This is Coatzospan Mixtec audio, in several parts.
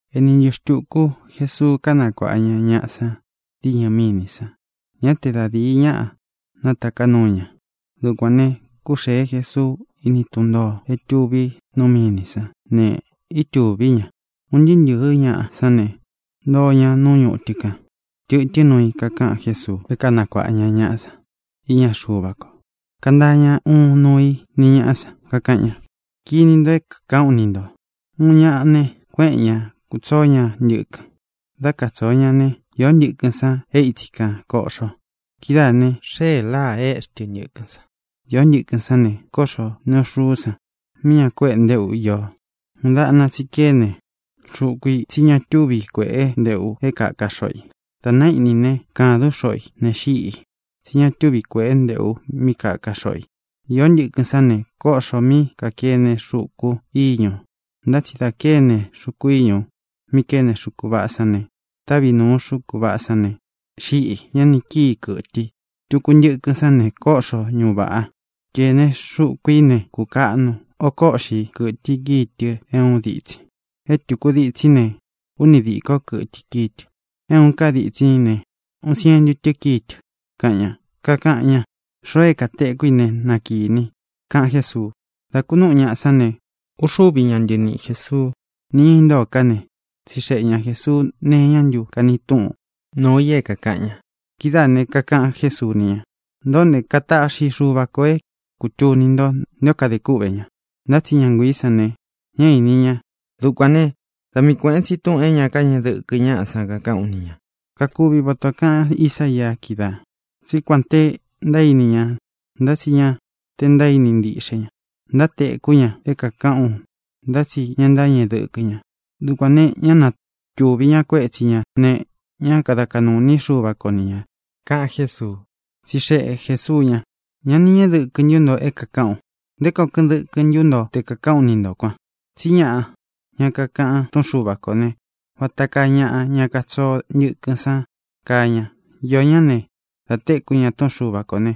Ēni ntuꞌu xtuku Jesuu kánakuāꞌa ña ñaꞌa san diñɨ mínī san. Ñá te da dīi ñaꞌa nátaká nuu ña. Dukuān ne, kúxēe Jesuu íni tun ntōo é tuví nu mínī sán ne, itúvi ña. Un ntɨɨ́ ntɨ̄ɨ́ ñaꞌa sán ne, ntoo ña nú ñutɨ kan. Tɨtɨ́n nuu i kakaꞌan Jésuu é kanakuāꞌa ña ñaꞌa san iña Xuva ko. Kantaa ña uun nuu i ni ñāꞌa san, kakaꞌan ña: —Kini nto é kākaꞌán u ni ntō: Uun ñaꞌa ne, kuéꞌen ña, kūtsoó ña ntɨkɨn. Dá katsōo ña né, īó ntɨkɨn san é itsi kan kōꞌxo. Kidáā ne, xée láā, éꞌxi tɨ ntɨkɨn san. Īó ntɨkɨn sán ne, kóꞌxo neꞌu xuú san mí ña kuéꞌe ntéꞌu iō. Uun dáꞌna tsi kéne xuku i, tsí ña tuvi kuéꞌe nteꞌu é kāka xoꞌo i. Dā naíꞌni ne, kādún xoꞌo ī ne, xíꞌī, tsí ña tuvi kuéꞌe nteꞌu mí kāka xoꞌo i. Īó ntɨkɨn sán ne, kóꞌxō mí kākene xuku íñū. Ntá tsi da kéne xuku íñū mi kéne xuku vaꞌá san ne, távi nūu xuku vaꞌá san ne, xíꞌī; ña ni kíi kɨ̄tɨ i. Tuku ntɨkɨn sán ne, kóꞌxo ñuꞌu vāꞌa. Kēne xuku í ne, kukaꞌnu. Oko úꞌxi kɨ̄tɨ i kíi tɨ é uun dítsin ī. É tūku ditsin í ne, úni dīkó kɨtɨ i kíi tɨ. É ūun ká ditsin í ne, uun sientu tɨ́ kíi tɨ —kaꞌan ña. Kakaꞌan ña: —Xoo é kātekú i ne, na kīni i —kaꞌan Jésuu. Dā kunúꞌu ñaꞌa sán ne, uxuvi ñá ntɨniꞌi Jēsuú nī ña intóo ká ne, tsixeꞌe ña Jēsuu nee iñá ntu kani túꞌun nuu i é kākaꞌan ña. Kidáā ne, kakaꞌan Jésuu ni ña: —Ntōꞌó ne, kataꞌxi Xuva ko é kūtuni nto nté o kadē kúꞌvē ña. Ntá tsi ña nguiī sán ne, ñá īni ña. Dukuān né, da mii kuēꞌen tsi túꞌūn é ña káñeꞌe dɨkɨ ñáꞌa san kakaꞌán u ni ñā. Kakuvi vata ō kaꞌan Ísaia kídaā, tsí kuān te ntaíni ña, ntá tsi ña te ntaíni ntíꞌxe ña. Ntátekú ña é kākaꞌán u, ntá tsi ña ntáñeꞌe dɨkɨ ña. Dukuān ne, ñá natūꞌvi ña kuétsi ñā ne, ñá kada kaꞌnū iní Xuva ko ni ñā —kaꞌan Jésuu. Tsixeꞌe Jēsuu ña: —¿Ñá nī ñeꞌe dɨkɨ ntu nto é kākaꞌán u? ¿Nté koo kɨꞌɨn dɨkɨ ntu nto te kāꞌán ka ú ni ntō kuan? Tsí ñaꞌa, ña kakaꞌan túꞌun Xuva kō né, vata kaa ñaꞌa, ña katsoo ntɨkɨn san, kaa ña. Iō ñáꞌa ne, dā téku ña túꞌun Xuva kō ne,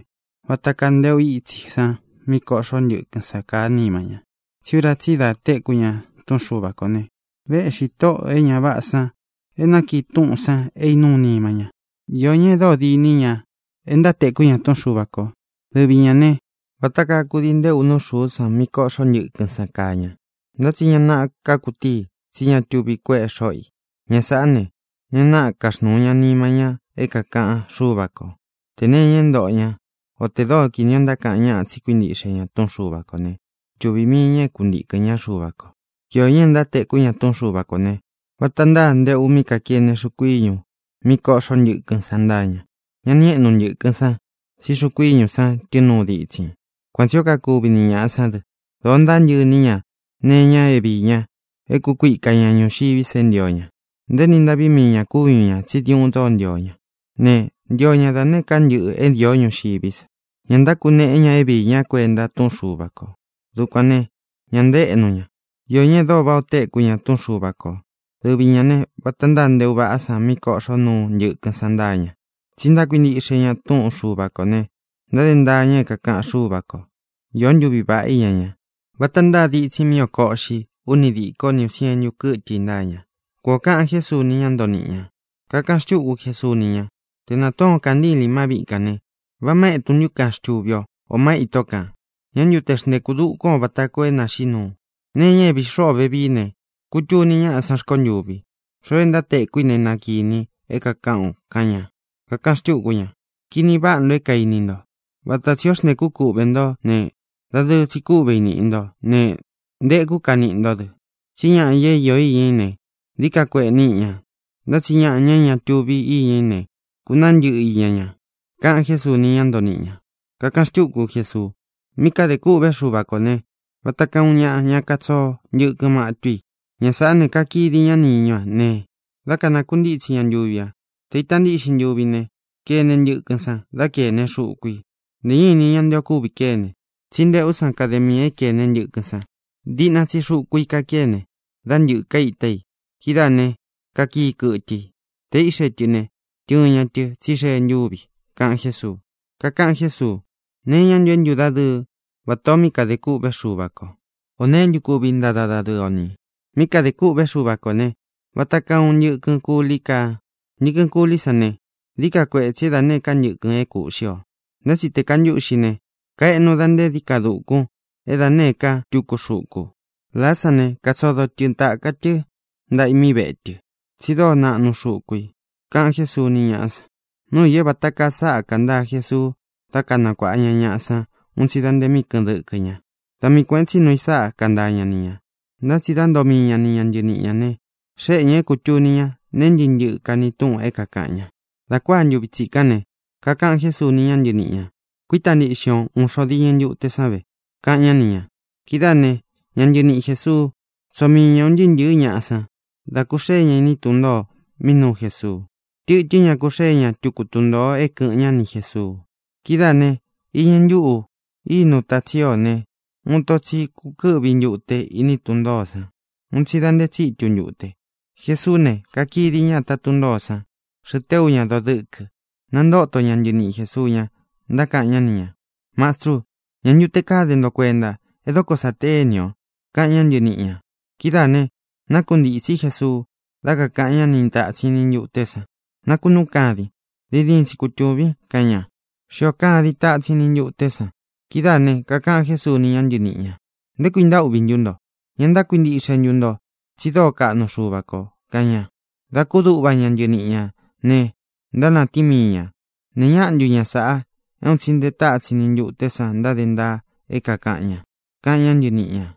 vata kaa nteꞌu ítsi san mí koꞌxó ntɨkɨn san kaá nima ña. Tsí ura tsí i da téku ña túꞌun Xuva kō ne, véꞌxi tóꞌō e ña váꞌā san é nakiꞌi túꞌūn san é īnúu nima ña. Iō ñá e dóo diní ña e ntátekú ña túꞌun Xuva kō. Dɨvi ñā ne, vata kaa kudii ntéꞌu nú xūú san mí koꞌxó ntɨkɨn san kaa ña. Ntá tsi ña naꞌa kakutíi i, tsí ña tuvi kuéꞌe xoꞌo i. Ña sāꞌá ne, ña náꞌa ntáxnuu ña nima ña é kākaꞌan Xúva kō. Tē nee iña é ntoꞌo ña, o tē dóo kini o ntákaꞌan ñáꞌa tsí kuintiꞌxe ña túꞌun Xuva kō né, xtuvī mii ña é kuntīkɨn ñá Xuva kō. Iō ñá e ntátekú ña túꞌun Xuva kō ne, vata ntáa nteꞌu mí kākene xuku íñū mí kōꞌxó ntɨkɨn san ntáa ña. Ña ni éꞌnu ntɨ̄kɨn san, tsí xuku íñu san tɨ́ɨn nuu ditsin i. Kuan tsī ó kakuvi ni ñāꞌa sán dɨ. Dōo ntántɨꞌɨ iní ña nee iñá vií ña. É kukuika ña ñuxiví sa é ntio ña. Ntaéni ntaꞌví mii ñā kúñu ñā tsí diuꞌun dóo ntio ña, ne, ntio ña da nēé ka ntɨꞌɨ̄ é īó ñuxiví sa. Ña ntákuneꞌe ña é viī ña kuenta túꞌun Xuva kō. Dukuān ne, ña ntaéꞌnu ña. Iō ñá e dóo váꞌā o téku ña túꞌun Xuva kō. Dɨvi ñā ne, vata ntáa nteꞌu vaꞌá san mí kōꞌxó nuu ntɨkɨn san ntáa ña. Tsí ntákuintiꞌxe ña túꞌun Xuva kō ne, ntáde ntaa ña é kākaꞌan Xúva kō. Īó ntuvi vāꞌá iña ña. Vata ntáa ditsin i mi kíi oko uꞌxi, uni díko, ni ūun sientu kɨ́tɨ i ntáa ña —kuan ō kaꞌan Jésuu ni ñá ntoo niꞌi ñā. Kakaꞌan xtúku Jesuu ni ña: —Te nātuún o kāntílīn má viꞌi kān ne, ¿vá ma etun ntú kan xtuvi o, ō má itó kān? ¿Ñā ntu te xntekú dukún ō vata koo é nāxiꞌí nuu? Nee iña é vīi xúꞌu o vēvií ne, kutuni ñáꞌa sán rkontûvi. Xoo é ntátekú i ne, na kīni i é kākaꞌán u —kaꞌan ña. Kakaꞌan xtúku ña: —Kini váꞌa nto é kaini nto. Vata tsī o xntéku kúꞌvē ntó ne, dadɨɨ tsi kúꞌve i nīꞌi ntó ne, ntekú ka niꞌi ntó dɨ. Tsí ñaꞌa, ña é īo iña í ne, dií ka kueꞌe níꞌi ña, ntá tsi ñaꞌa, ña é ña tuvi íña í ne, kunaá ntɨꞌɨ iña ña —kaꞌan Jésuu ni ñá ntoo niꞌi ñā. Kakaꞌan xtúku Jesuu: —Mí kadē kûꞌvé Xuva kō né, vata kaa uun ñaꞌa, ña katsoo ntɨkɨn matú i. Ña sāꞌá ne, kakidi ñá niñú a ne, dá kanākuntítsi ña ntuvi ā. Tē ita ntíꞌxin ntuvi ne, kene ntɨkɨn san, dá kēne xuku i. Ntē ñá ini ña nté ō kúvi kéne, tsí nteꞌú san kade miī é kēne ntɨkɨn san. Diꞌna tsi xuku i kakéne ne, dá ntɨ̄ka íta i. Kidáā ne, kakii kɨtɨ i. Tē íꞌxe tɨ ne, tɨɨn ña tɨ, tsí xee ntúvi ī —kaꞌan Jésuu. Kakaꞌan Jésuu: —¿Nee iñá ntu é ntudadɨɨ vatā o mí kadē kûꞌvé Xuva kō? ¿Ō neé ntu kuvi ntada dadɨɨ o ni ī? Mí kadē kûꞌvé Xuva kō ne, vata kaa uun ntɨkɨn kuli kaa. Ntɨkɨn kulí san ne, dií ka kuetsī é da nēé ka ntɨkɨn é kūꞌxí ō. Ntá tsi tē kantúꞌxi ne, kaeꞌnu da nte dií ka dukun é da nēé ka tuku xuku. Lāá san ne, katsodo tɨ tāka tɨ́ ntaꞌa i mí vētɨ, tsi dóo naꞌnu xuku ī —kaꞌan Jésuu ni ñáꞌa san. Núu ī é vāta kaa sáꞌa kantaa Jesuu dá kanakuāꞌa ña ñaꞌa san un tsi da nte míꞌi kɨ̄ꞌɨn dɨkɨ ña. Da mii kuēꞌen tsí nuu i sáꞌa kantaa ña ni ñā. Ntá tsi dá ntoo mii ña ni ña ntɨniꞌi ñā ne, xéꞌe ñā é kūtuni ña nee ntɨ́ꞌɨ ntɨꞌɨ kani túꞌun é kākaꞌan ña. Dā kuáa ntuvi tsikán ne, kakaꞌan Jésuu ni ña ntɨníꞌi ñā: —Kuíta ntiꞌxin o ūun xo diñɨ ntute san ve —kaꞌan ñá ni ñā. Kidáā né, ña ntɨniꞌi Jēsuu tsóo mii ña ūn ntɨɨ́ ntɨ̄ɨ́ ñaꞌa san, dá kūxée ña iní tun ntōo mí nuu Jesuu. Tɨtɨ́n ñaꞌa kūxée ña tuku tun ntōo é kɨ̄ꞌɨn ñá ni Jēsuu. Kidáā ne, iñɨ ntúꞌu ínu tātsín ō ne, uun ito tsi kukɨ́ꞌvi ntūte iní tun ntōó san un tsi da nte tsítu ntute. Jesuú ne, kakidi ña ata tún ntōó san, xɨꞌɨ téu ña doo dɨ́kɨ. Nantóto ña ntɨniꞌi Jēsuu ña, ntákaꞌan ñá ni ñā: —¡Mastrû! ¿Ñā ntu te káde nto kuenta é dóko sa téni ō? —kaꞌan ñá ntɨniꞌi ñā. Kidáā ne, nákuntītsí Jesuu, dá kakāꞌan ñá ni tātsin ni ntuté san: —¡Nakunúun kadin! ¡Diin diin tsi kutūvin! —kaꞌan ña. Xíō kadin tatsin ni ntuté san. Kidáā ne, kakaꞌan Jésuu ni ña ntɨníꞌi ñā: —¿Nté kui ntaúꞌvī ntú nto? ¿Ña ntákuintiꞌxe ntu nto tsi dóo kaꞌnu Xuva kō? —kaꞌan ña. Dā kúduꞌva ña ntɨniꞌi ñā ne, ntánatíin mii ñā: —¿Nēe ñáꞌa ntu ña sāꞌa é un tsi nte tatsin ni ntuté san ntáde ntaa é kākaꞌan ña? —kaꞌan ñá ntɨniꞌi ñā.